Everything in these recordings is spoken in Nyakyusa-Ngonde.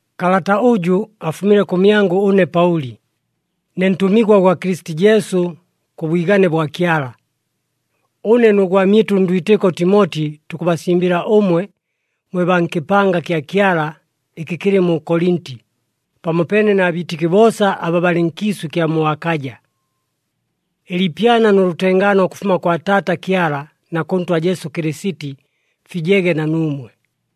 Kalata ʉjʉ afumile kʉmyangʉ ʉne Paʉli, ne ntʉmigwa gwa Kɨlɨsiti Jesu, kʉ bwigane bwa Kyala. Ʉne nʉ gwamyɨtʉ ndwitɨko Timoti tukʉbasimbɨla ʉmwe mwe baa nkɨpanga kya Kyala ɨkɨ kɨlɨ mu Kolinti, pamopeene na biitɨki boosa aba balɨ nkiisʉ ɨkya mu Akaja. Ɨliipyana nʉ lʉtengaano ʉkʉfuma kwa Taata Kyala na kʉ Ntwa Jesu Kɨlɨsiti, fijege na nuumwe.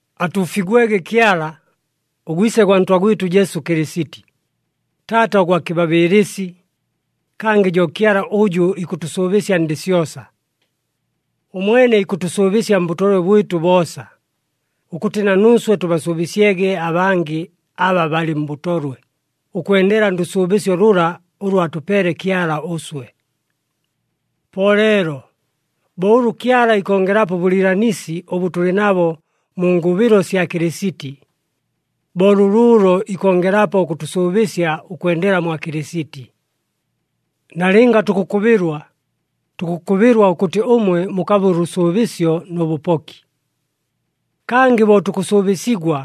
Atuufigwege Kyala, ʉGwise gwa Ntwa gwɨtʉ Jesu Kɨlɨsiti, Taata ʉgwa kɨbabɨɨlɨsi, kangɨ jo Kyala ʉjʉ ikʉtʉsʉʉbɨsya ndɨ syosa. Ʉmwene ikʉtʉsʉʉbɨsya mbʉtolwe bwɨtʉ boosa, ʉkʉtɨ na nuuswe tʉbasʉʉbɨsyege abangɨ aba balɨ mbʉtolwe, ʉkwendela ndʉsʉʉbɨsyo lʉla ʉlʉ atʉpeele Kyala ʉswe. Po leelo, bo ʉlʉ Kyala ikongelapo ʉbʉlɨɨlanisi ʉbʉ tʉlɨ nabo mu ngʉbɨlo sya Kɨlɨsiti, bo lʉlʉʉlo ikongelapo ʉkʉtʉsʉʉbɨsya ʉkwendela mwa Kɨlɨsiti. Nalɨnga tukʉkʉbɨlwa, tukʉkʉbɨlwa ʉkʉtɨ ʉmwe mukabe ʉlʉsʉʉbɨsyo nʉ bʉpoki. Kangɨ bo tukʉsʉʉbɨsigwa,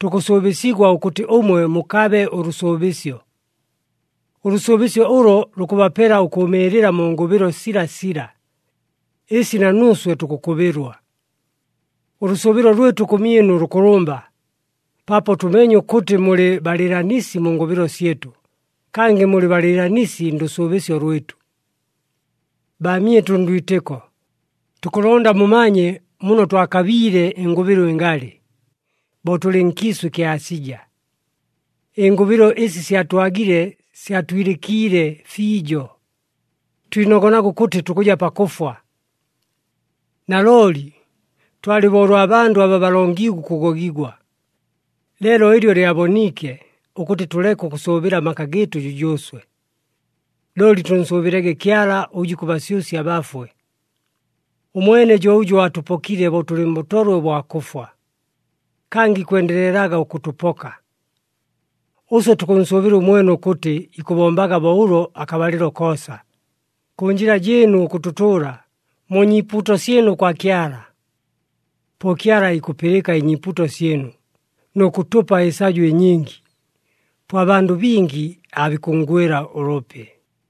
tukʉsʉʉbɨsigwa ʉkʉtɨ ʉmwe mukabe ʉlʉsʉʉbɨsyo. Ʉlʉsʉʉbɨsyo ʉlo lukʉbapela ʉkʉʉmɨɨlɨla mu ngʉbɨlo silasila, ɨsi na nuuswe tukʉkʉbɨlwa. Ʉlʉsʉʉbɨlo lwɨtʉ kʉmyɨnu lʉkʉlʉmba, paapo tʉmeenye ʉkʉtɨ mulɨ balɨɨlanisi mu ngʉbɨlo syɨtʉ, kangɨ mulɨ balɨɨlanisi ndʉsʉʉbɨsyo lwɨtʉ. Baamyɨtʉ ndwitɨko, tukʉlonda mumanye muno twakabiile ɨngʉbɨlo ɨngalɨ, bo tʉlɨ nkiisʉ ɨkya Asija. Ɨngʉbɨlo ɨsi syatwagile syatwilɨkiile fiijo, twinogonaga ʉkʉtɨ tukʉja pakʉfwa. Nalooli twalɨ bo ʉlwa bandʉ aba balongiigwe ʉkʉgogigwa. Leelo ɨlyo lyaboniike, ʉkʉtɨ tʉleke ʉkʉsʉʉbɨla amaka gɨɨtʉ jʉjʉʉswe, looli tʉnsʉʉbɨlege Kyala ʉjʉ ikʉbasyʉsya abafwe. Ʉmwene jo ʉjʉ aatʉpokile bo tʉlɨ mbʉtolwe ʉbwa kʉfwa, kangɨ ikwendelelaga ʉkʉtʉpoka. Ʉswe tukʉnsʉʉbɨla ʉmwene ʉkʉtɨ ikʉbombaga bo ʉlo akabalɨlo koosa, kʉ njɨla jɨɨnu ʉkʉtʉtʉʉla, mu nyiipuuto syɨnu kwa Kyala. Po Kyala aikʉpɨlɨka ɨnyiipuuto syɨnu, nʉ kʉtʉpa ɨsajo ɨnyingi. Po abandʉ bingi aabikʉnngwɨla ʉlʉpi.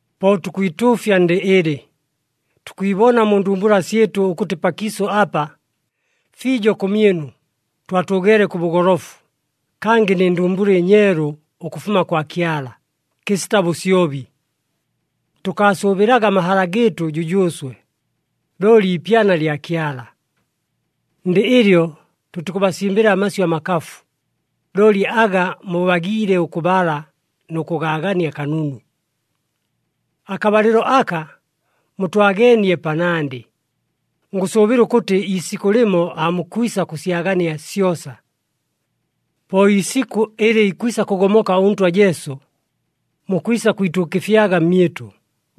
Po tukwituufya ndɨ ɨlɨ, tukwibona mu ndumbula syɨtʉ ʉkʉtɨ pakiisʉ apa, fiijo kʉmyɨnu, twatʉʉgeele kʉ bʉgolofu, kangɨ nɨ ndumbula ɨnyeelu ʉkʉfuma kwa Kyala, kɨsita bʉsyobi. Tʉkaasʉʉbɨlaga amahala gɨɨtʉ jʉjʉʉswe, looli ipyana lya Kyala. Ndɨ ɨlyo tʉtikʉbasimbɨla amasyʉ amakafu, looli aga mubagiile ʉkʉbala nʉ kʉgaagania kanunu. Akabalɨlo aka mutwageenie panandɨ, ngʉsʉʉbɨla ʉkʉtɨ iisikʉ lɨmo aamukwisa kʉsyagania syosa. Po iisikʉ ɨlɨ ikwisa kʉgomoka ʉNtwa Jesu, mukwisa kwituukɨfyaga mmyɨtʉ,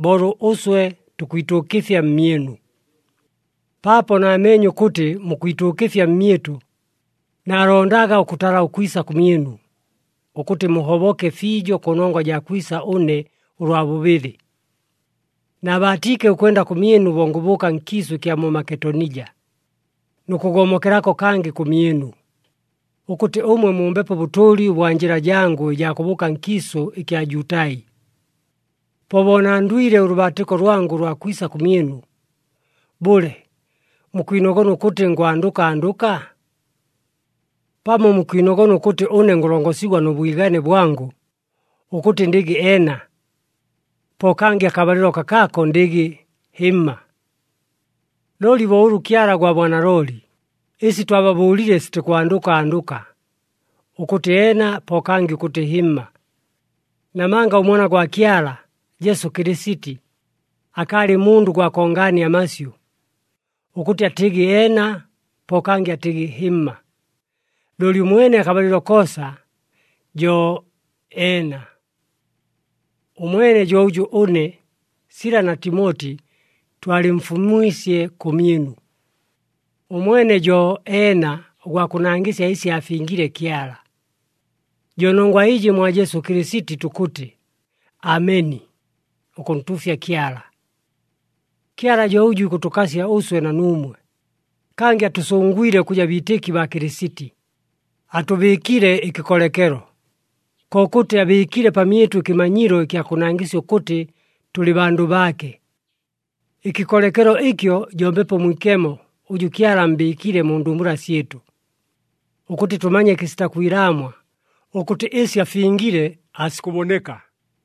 bo ʉlʉ ʉswe tukwituukɨfya mmyɨnu. Paapo naameenye ʉkʉtɨ mukwituukɨfya mmyɨtʉ, naalondaga ʉkʉtala ʉkwisa kʉmyɨnu, ʉkʉtɨ muhoboke fiijo kʉnongwa jaa kwisa ʉne ʉlwa bʉbɨlɨ. Naabaatiike ʉkwenda kʉmyɨnu bo ngʉbʉʉka nkiisʉ ɨkya mu Maketonija, nʉ kʉgomokelako kangɨ kʉmyɨnu, ʉkʉtɨ ʉmwe mumbepo ʉbʉtʉʉli ʉbwa njɨla jangʉ ɨjaa kʉbʉʉka nkiisʉ ɨkya Jutai. Po bo nandwile ʉlʉbaatɨko lwangʉ ʉlwa kwisa kʉmyɨnu, bʉle, mukwinogona ʉkʉtɨ ngwandʉka andʉka? Pamo mukwinogona ʉkʉtɨ ʉne ngʉlongosigwa nʉ bwigane bwangʉ, ʉkʉtɨ ndɨgɨ, “Eena,” po kangɨ akabalɨlo kakaako ndɨgɨ, “Hɨmma!” Looli bo ʉlʉ Kyala gwa bwanalooli, ɨsi twababʉʉlile sitikwandʉka andʉka, ʉkʉtɨ, “Eena,” po kangɨ ʉkʉtɨ, “Hɨmma.” Namanga ʉMwana gwa Kyala, Jesu Kɨlɨsiti, akaalɨ mundʉ gwa kongaania amasyʉ, ʉkʉtɨ atɨgɨ, “Eena,” po kangɨ atɨgɨ, “Hɨmma.” Looli ʉmwene akabalɨlo koosa jo, “Eena.” Ʉmwene jo ʉjʉ ʉne, Sila na Timoti twalɨmfumwisye kʉmyɨnu. Ʉmwene jo, “Eena,” ʉgwa kʉnangɨsya ɨsi aafingile Kyala. Jo nongwa ɨjɨ mwa Jesu Kɨlɨsiti tukʉtɨ, “Ameni,” ʉkʉntuufya Kyala. Kyala jo ʉjʉ ikʉtʉkasya ʉswe na nuumwe, kangɨ atʉsʉngwile ʉkʉja biitɨki baa Kɨlɨsiti, atʉbɨɨkile ɨkɨkolekelo, kokʉtɨ abɨɨkile pamyɨtʉ ɨkɨmanyilo ɨkya kʉnangɨsya ʉkʉtɨ tʉlɨ bandʉ baake. Ɨkɨkolekelo ɨkyo jo Mbepo Mwikemo ʉjʉ Kyala ammbɨɨkile mu ndumbula syɨtʉ, ʉkʉtɨ tʉmanye kɨsita kwilaamwa, ʉkʉtɨ ɨsi afingile aasikʉboneka.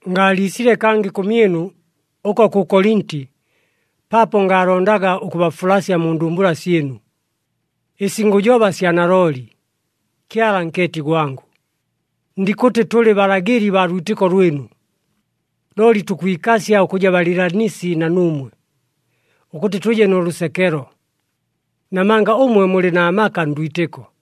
Ngaaliisile kangɨ kʉmyɨnu, ʉko kʉ Kolinti, paapo ngaalondaga ʉkʉbafulasya mu ndumbula syɨnu. Ɨsi ngʉjoba sya nalooli, Kyala nkeeti gwangʉ. Ndikʉtɨ tʉlɨ balagɨli baa lwitɨko lwɨnu, looli tukwikasya ʉkʉja balɨɨlanisi na nuumwe, ʉkʉtɨ tʉje nʉ lʉsekelo. Namanga ʉmwe mulɨ na maka ndwitɨko.